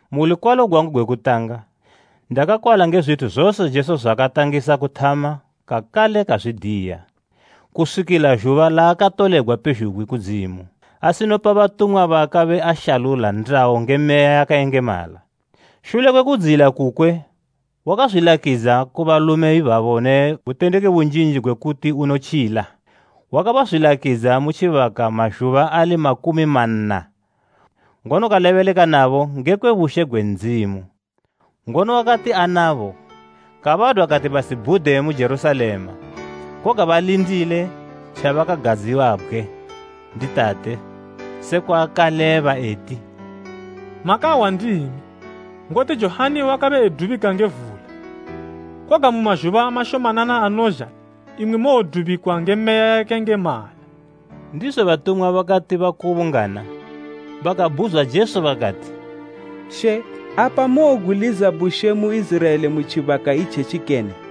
Mu lukwalo gwangu gwe kutanga, Teofilo, ndakakwala ngekwe zwithu zose Jesu zwaakatangisa kuthama kakale kazwidiya, kuswikila zhuba laakatolegwa pezhugwi kudzimu, asinopa batumwa baakabe ashalula ndayo nge Meya yakayengemala. Shule kwe kudziyila kukwe wakazwilakidza ku balume ibabo ne butendeki bunjinji gwe kuti unotjila. Wakabazwilakidza mu tjibaka mazhuba ali makumi manna, ngono kalebeleka nabo ngekwe bushe gwe Ndzimu. Ngono wakati anabo, kabadwa kati basibhude mu Jerusalema, koga balindile tjabakagadziwabgwe ndi Tate, sekwa akaleba eti, “Makahwa ndimi, ngoti Johani wakabe edubika nge vula, koga mu mazhuba mashomanana anozha imwi mowodubikwa nge Meya yakayengemala.” Ndizo batumwa bakati bakubungana, bakabhuzwa Jesu bakati, “She, apa mowobgwiliza bushe mu Iziraela mu tjibaka itjetji kene?”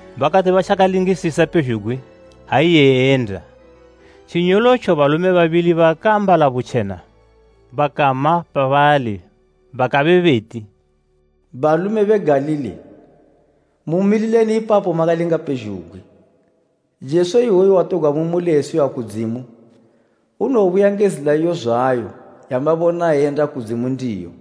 Bakati batjakalingisisa pezhugwi ha iye eyenda, tjinyolotjo balume babili bakaambala butjena bakama pabali bakabe beti, “Balume be Galili mumilileni ipapo makalinga pezhugwi? Jesu iwoyu, watogwa mu muli eyisiwa kudzimu, unowobuya nge zila iyo zwayo yamabona eyenda ku Ndzimu ndiyo.”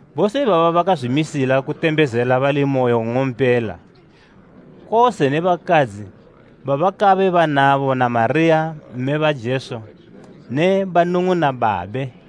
Bose ibaba bakazwimisila kutembezela bali moyo nng'ompela, kose ne bakadzi babakabe banabo na Mariya mme ba Jesu ne banung'una babe.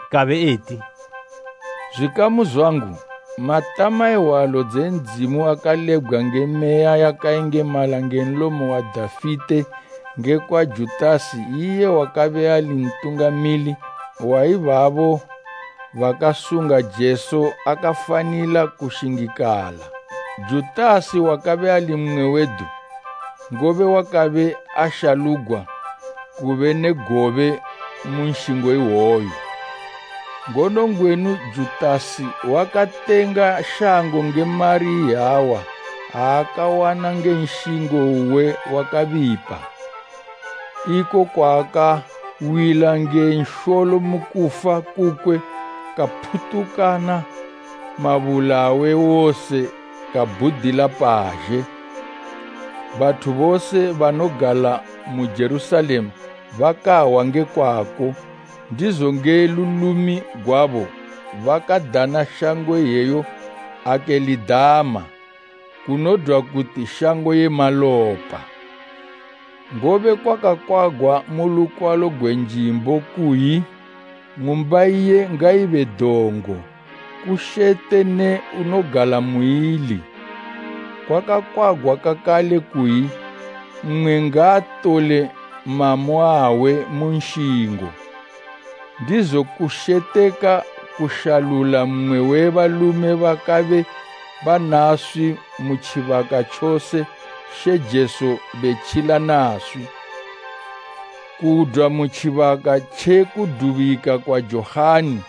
kabe eti, “Zwikamu zwangu, matama e hwalo dze Ndzimu akalebgwa nge Meya yakayengemala nge nlomo wa Dafite ngekwa Judasi iye wakabe ali ntungamili wa ibabo bakasunga Jesu akafanila kushingikala. Judasi wakabe ali mmwe wedu, ngobe wakabe ashalugwa kube ne gobe mu nshingo iwoyu.” Ngono ngwenu Judasi wakatenga shango nge mari iyawa aakawana nge nshingo uwe wakabipa, iko kwaakawila nge nsholo mu kufa kukwe kaphutukana mabula awe wose kabhudila pazhe. Bathu bose banogala mu Jerusalema bakahwa nge kwako, ndizo nge lulimi gwabo bakadana shango iyeyo Akelidama, kunodwa kuti, Shango ye Malopa. “Ngobe kwakakwagwa mu lukwalo gwe Njimbo kuyi, “ ‘Ng'umba iye ngaibe dongo; kushete ne unogala muili.’ “Kwakakwagwa kakale kuyi, “ ‘Mmwe ngaatole mamo awe mu nshingo.’ “Ndizo kusheteka kushalula mmwe we balume bakabe banaswi mu tjibaka tjose She Jesu betjila naswi, kudwa mu tjibaka tjekudubika kwa Johani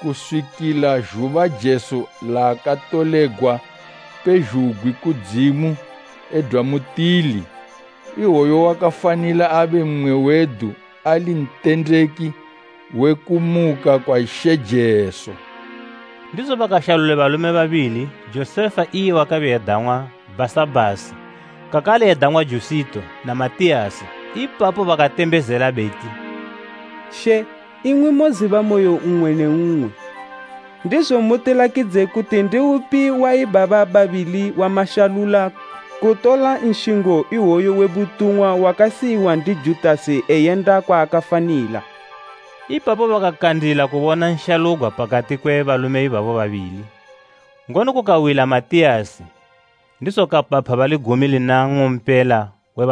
kuswikila zhuba Jesu laakatolegwa pezhugwi kudzimu edwa mutili, iwoyo wakafanila abe mmwe wedu ali ntendeki we kumuka kwa She Jesu.” Ndizo bakashalula balume babili, Josefa iye wakabe edang'wa Bhasabhasi, kakale edang'wa Jusito, na Matiyasi. Ipapo bakatembezela beti, “She, imwi moziba moyo we mmwe ne mmwe, ndizo mutilakidze kuti ndi upi wa ibaba babili wamashalula kutola nshingo iwoyu we butumwa wakasiyiwa ndi Judasi eyenda kwaakafanila.” Ipapo bakakandila kubona nshalugwa pakati kwe balume ibabo babili, ngono kukawila Matiyasi, ndizo kapapha bali gumi lina nng'ompela.